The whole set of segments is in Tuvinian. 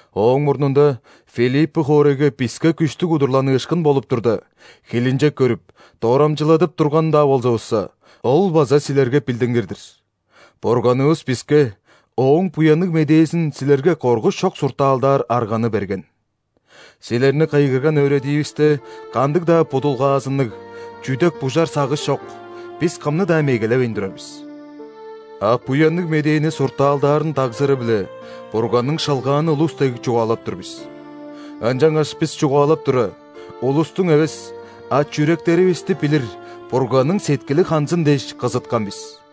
Ооң мурнунда Филиппы хоорайга биске күштүг удурланыышкын болуп турда, хилинчек көрүп, дорамчыладып турган-даа болзувусса (ол база силерге билдингир-дир), Бурганывыс биске Ооң Буянныг Медээзин силерге коргуш чок суртаалдаар арганы берген. Силерни кыйгырган өөредивиисте кандыг-даа будулгаазынныг, чүдек-бужар сагыш чок, бис кымны-даа мегелевейн турар бис. А Буянныг Медээни суртаалдаарын дагзыры-биле Бурганның шылгааны улус дег чугаалап тур бис. Ынчангаш бис чугаалап тура, улустуң эвес, а чүректеривисти билир Бурганның сеткили ханзын дээш, кызыткан бис.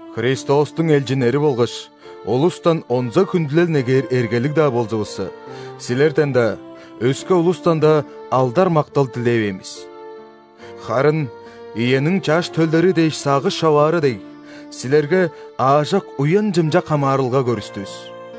Христостуң элчиннери болгаш, улустан онза хүндүлел негээр эргелиг-даа болзувусса, силерден-даа, өске улустан-даа алдар-мактал дилевээн бис. Харын иениң чаш төлдери дээш сагыш човаары дег, силерге аажок уян-чымчак хамаарылга көргүстүвүс.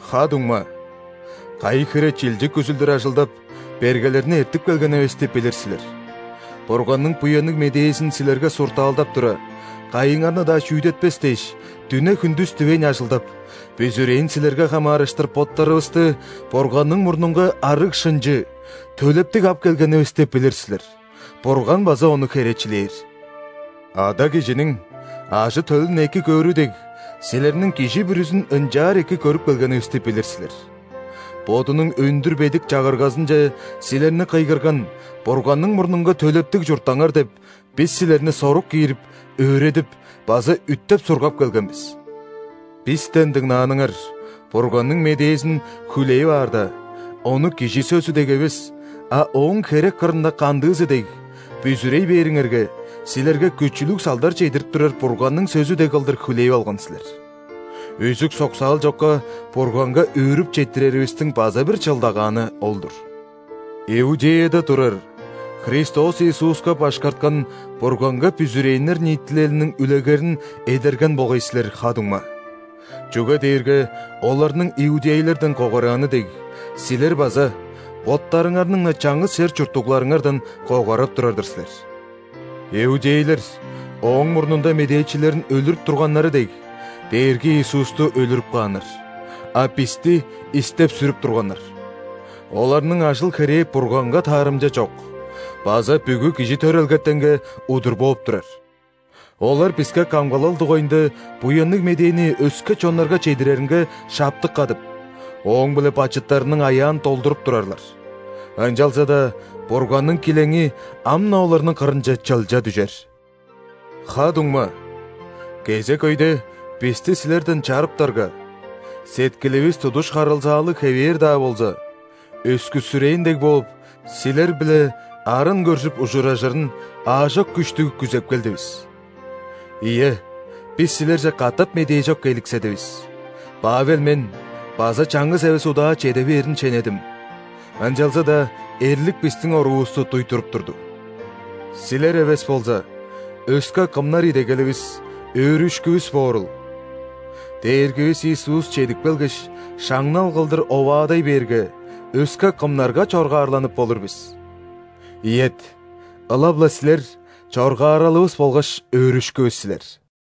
Ха-дуңма, кайы хире чилчик үзүлдүр ажылдап, бергелерни эртип келгенивисти билир силер. Бурганның Буянныг Медээзин силерге суртаалдап тура, кайыңарны-даа шүүдетпес дээш, дүне-хүндүс дивейн ажылдап, бүзүрээн силерге хамаарыштыр боттарывысты Бурганның мурнунга арыг-шынчы, төлептиг ап келгенивисти билир силер, Бурган база ону херечилээр. Ада кижиниң ажы-төлүн эки көөрү дег, силерниң кижи бүрүзүн ынчаар эки көрүп келгенивисти билир силер: «Бодунуң өндүр бедик Чагыргазынче силерни кыйгырган Бурганның мурнунга төлептиг чурттаңар» – деп, бис силерни сорук киирип, өөредип база үттеп-сургап келген бис. Бистен дыңнааныңар Бурганның медээзин хүлээп аарда, ону кижи сөзү дег эвес, а ооң херек кырында кандыызы дег: бүзүрей бээриңерге, силерге күчүлүг салдар чедирип турар Бурганның сөзү дег кылдыр хүлээп алган силер. Үзүк-соксаал чокка Бурганга өөрүп четтиреривистиң база бир чылдагааны ол-дур. Иудеяда турар Христос Иисуска башкарткан Бурганга бүзүрээннер ниитилелиниң үлегерин эдерген болгай силер, ха-дуңма. Чүге дээрге оларның иудейлерден когарааны дег, силер база боттарыңарның-на чаңгыс чер чурттугларыңардан когарап турар-дыр силер. Иудейлер, ооң мурнунда медээчилерин өлүрүп турганнары дег, Дээрги Иисусту өлүрүп кааннар, а бисти истеп-сүрүп турганнар. Оларның ажыл-херээ Бурганга таарымча чок база бүгү кижи төрелгетенге удур бооп турар. Олар биске камгалал дугайында Буянныг Медээни өске чоннарга чедиреринге шаптык кадып, ооң-биле бачыттарының аяан долдуруп турарлар. Ынчалза-даа Бурганның килеңи ам-на оларның кырынче чылча дүжер! Ха-дуңма, кезек өйде бисти силерден чарыптарга, сеткиливис тудуш харылзаалыг хевээр-даа болза, өскүссүрээн дег бооп, силер-биле арын көржүп ужуражырын аажок күштүг күзеп келдивис. Ийе, бис силерже катап медээжок келикседивис, Павел мен база чаңгыс эвес удаа чеде бээрин шенедим, ынчалза-даа эрлик бистиң оруувусту дуй туруп турду. Силер эвес болза, өске кымнар идегеливис, өөрүшкүвүс боорул? Дээргивис Иисус чедип келгеш, шаңнал кылдыр оваадай бээрге, өске кымнарга чоргаарланып болур бис? Ийет, ылап-ла силер – чоргааралывыс болгаш өөрүшкүвүс силер!